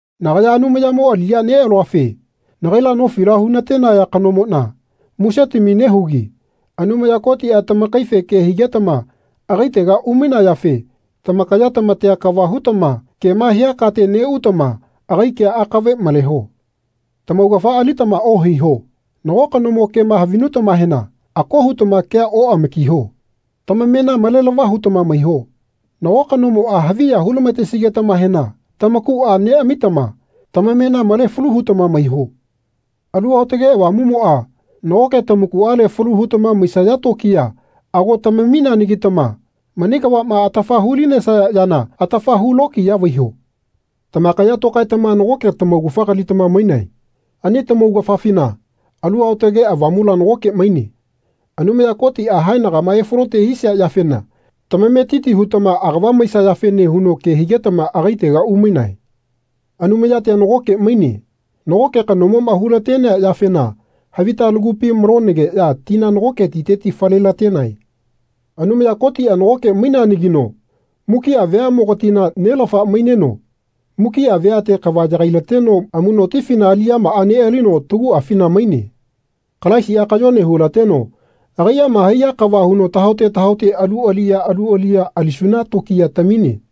Nagaya Anumayamo aliya nealuafe nagaila nofila hunatenaya kanomona musetami nehugi Anumaya Kotia tamakaife ke higetama agaitega umainayafe tamakaya tamatea kava hutama kema hia kate neutama agai kea akave maleho. Tamaugafa alitama ohaiho. Nago kanomo kema havinutamahena ako hutama kea oamakiho. Tamamena malelava hutama maiho. Nago kanomoa haviya hu-lamatesigetamahena tamakua neamitama tamamena male falu hutama maiho. Alu Aotake Avamumoa nagoke tamakuale falu hutama maisaya tokiya ago tamamineanagitama mani kavama atafa hu-linesaya yana atafa hu lokiya vaiho. Tamakaya tokaetama nagoke tamaugafa kalitama mainae. Ani lamaugafafina Alu Aotage Avamula nagoke maine. Anumaya Kotia haenagama efalote hisia yafena tamametiti hutama agava maisayafene huno ke higetama agaitega umainae. Anumayatia nagoke maine. Nagoke kanomoma hulatenea yafena havita lamakupi malonageya tina nagoke titeti fale-latenae. Anumaya Kotia nagoke maineanagino mukia veamogatina nelafa maineno mukia veate kava yagai-lateno amunotifina aliyamaa nealino taguafina maine. Kalaisia kayone hulateno agaiama haiya kava huno tahaote tahaote alu aliya alu aliya alisuna tokiya tamine.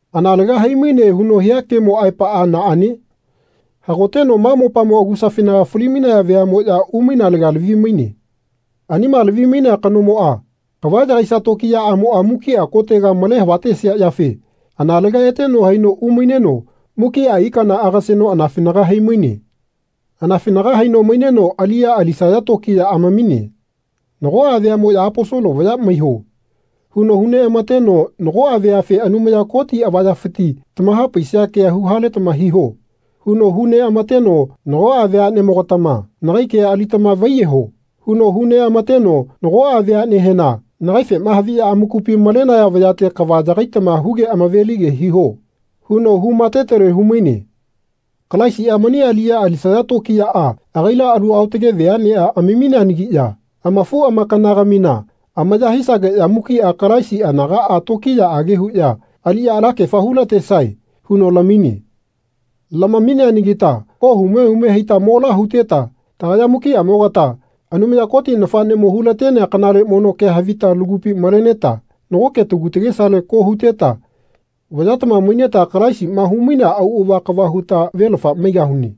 Analega hai-maine huno hia kemo aepaa naane? Hagoteno ma mopamo agusafinaga fali-mainaya veamoya umainalega lavi-maine. Anima lavi-mainea kanomoa kava yagaisia tokiyaamoa mukia kotega male havatesia yafe analega eteno haino umaineno mukia ikana agaseno anafinaga haimaine. Anafinaga haino maineno aliya alisaya tokiya amamine. Nagoa veamoya Aposolo vaya maiho. huno huneamateno nagoa veafe Anumaya Kotina avayafiti tamahapaisia kea huhaletama hiho. huno hu neamateno nagoa veanemogatama Nagai kea alitama vaiyeho. huno hu neamateno nagoa veanehena Nagaifema haviya amakupi malenaya vayate kava yagaitama huge amavelige hiho. huno hu matetele humaine. Kalaisia mani aliya alisaya tokiyaa agaila alu aotage veanea amamineanagiya amafuamakana-gamina amaya hisageya mukia Kalaisi anagaa tokiyaage huya aliya alakefa hulatesae huno lamine. Lamineanagita ko hume hume haita mola huteta tagaya mukiamogata Anumaya Koti nafanemo hulatenea kanale mono kea havita lagupi maleneta nagoke tagu tagesale ko huteta vayatama maineta Kalaisima humainea auava kava huta velafa maigahune.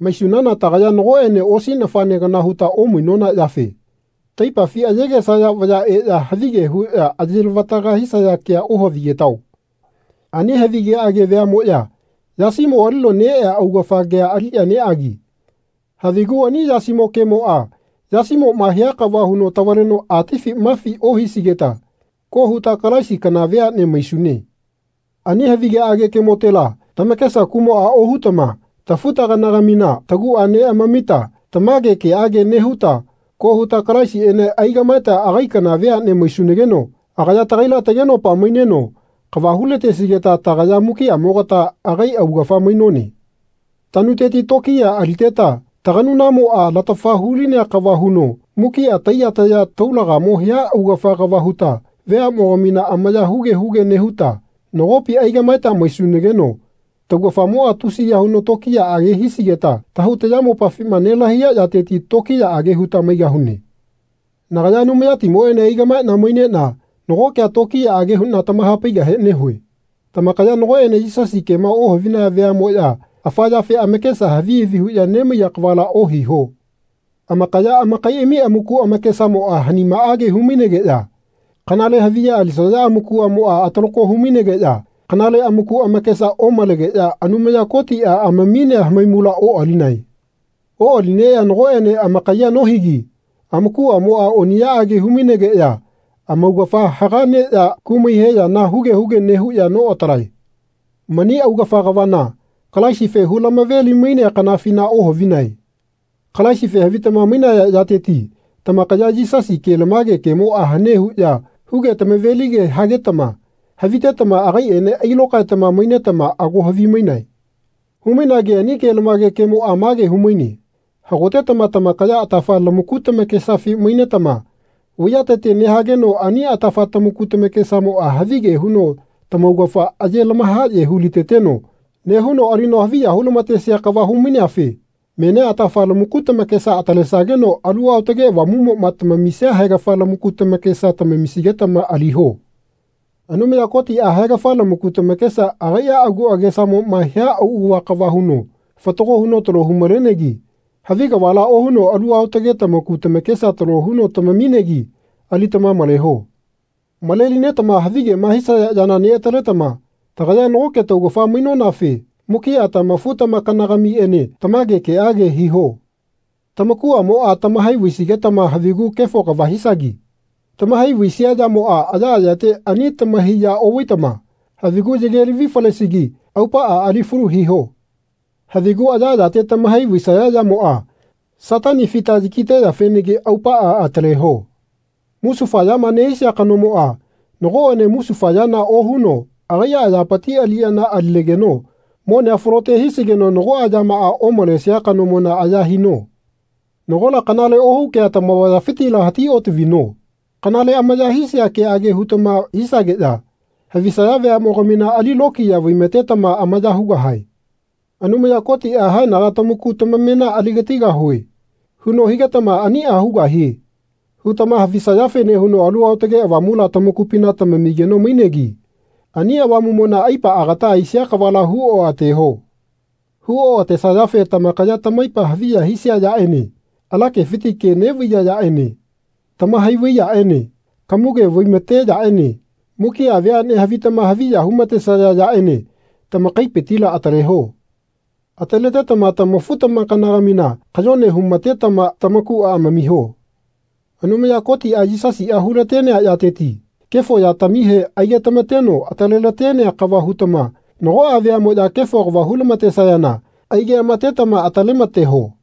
Maisunana tagaya nagoene osi nafane kana huta omainona yafe taipafi ayegesaya vaya eya havige huya ayelavataga hisaya kea ohavigetao. Ani havigeage vayamoya yasimo alino neea augafa kea aliya neagi havigu ani yasimo kemoa yasimoma hia kava huno tavaleno atifi mafi ohisigeta ko huta Kalaisi kana veane maisune. Ani havigeage kemotela tamakesa kumoa ohutama tafu-tagana-gamina tagua neamamita tamage keage nehuta ko huta Kalaisiene aigamaeta agai kana veane maisunageno agaya tagaila tagenopa maineno kava hu-latesigeta tagaya mukiamogata agai augafa mainone. Tanuteti tokiya aliteta taganunamoa latafa hulinea kava huno mukia taiya taya taulagamo hia augafa kava huta veamogamina amaya huge huge nehuta nagopi aigamaeta maisunageno taugafamoa tusiya huno tokiyaage hisigeta tahau tayamopafima nelahaiya yateti tokiyaage huta maigahune. Nagaya Anumayatimoene aigamaena mainena nago kea tokiyaage huna tamahapaigahe nehue. Tamakaya nagoene Yisasi kema ohavinaya veamoya afa yafe amakesa havi havi huya nemaiya kavala ohiho. Amakaya amakaiami amaku amakesamoa hanimaage humainegeya kanale haviya alisaya amakuamoa atalako humainegeya kanale amaku amakesa omalegeya Anumaya Kotia amaminea hamaimula oalinae. Oalineya nagoene amakayea nohigi amakuamoa oniyaage humainegeya amaugafa haga neya kumai he yana huge huge nehuya noatalae. Mani augafa kavana Kalaisife hulamave-limainea kanafina ohavinae. Kalaisife havitama mainaya yateti tamakaya Yisasi kelamage kemoa hane huya huge tamavelige hagetama havitetama agaiene ailokaetama mainetama ago havimainae. Havimainagi ani kelamage kemoa mage humaine hagotetama tamakaya atafa lamaku lamakesafi mainetama vaiyatete nehageno ani atafa tamaku tamakesamoa havige huno tamaugafa age lamahaye huliteteno nehuno alino haviya hulamatesia kava humaineafe menia atafa lamaku tamakesa atalesageno Alu Aotage Avamumoma tamamisia haegafa lamaku tamakesa tamamisigetama aliho. Anumaya Kotia haegafa lamaku tamakesa agaia agu agesamoma hia auava kava huno fatago huno talo humalenegi havi kavala ohuno alu aotage tamaku tamakesa talo huno tamaminegi alitama maleho. Malelinetama havigema hisaya yana neataletama tagaya nagoke taugafa mainonafe mukia tamafu-tamakana-gamiene tamage keage hiho. Tamakuamoa tamahai vaisigetama havigu kefo kava hisagi. Tamahai vaisia yamoa ayaayate ani tamahai ya ovaitama havigu yage lavi falesigi aupaa alifalu hiho. Havigu ayaayate tamahai vaisaya yamoa Satani fita yakiteyafenagi aupaa ataleho. Musufa yama nehisia kanomoa nagoene musufa yana ohuno agaia ayapiti aliyana alinegeno monea falote hisigeno nagoa yamaa omalesia kanomona aya hino. Nagola kanale ohu kea tamavayafitila hati otavino. Kanale amaya hisia keage hutama hisageya havisaya veamogamina ali lokiya vaimatetama amaya hugahae. Anumaya Kotia Haenaga tamaku tamamena aligatigahue. huno higetama Ania hugahie. hutama havisayafene huno Alu Aotage Avamula tamakupina tamamigeno mainegi ani Avamumona aipa agata aisia kavala huoateho. Huoatesayafe tamakaya tamaipa haviya hisia yaene ala kefiti ke nevaiya yaene tamahai vai yaene kamuge vaimate yaene mukia veane havitama haviya humatesaya yaene tamakaipitila ataleho. Ataletetama tamafu-tamakana-gamina kayone humatetama tamakua amamiho. Anumaya Kotia Yisasia hulatenea yateti kefo yatamihe aigetamateno atalelatenea kava hutama nagoa veamoya kefo kava hulamatesayana aigeamatetama atalemateho.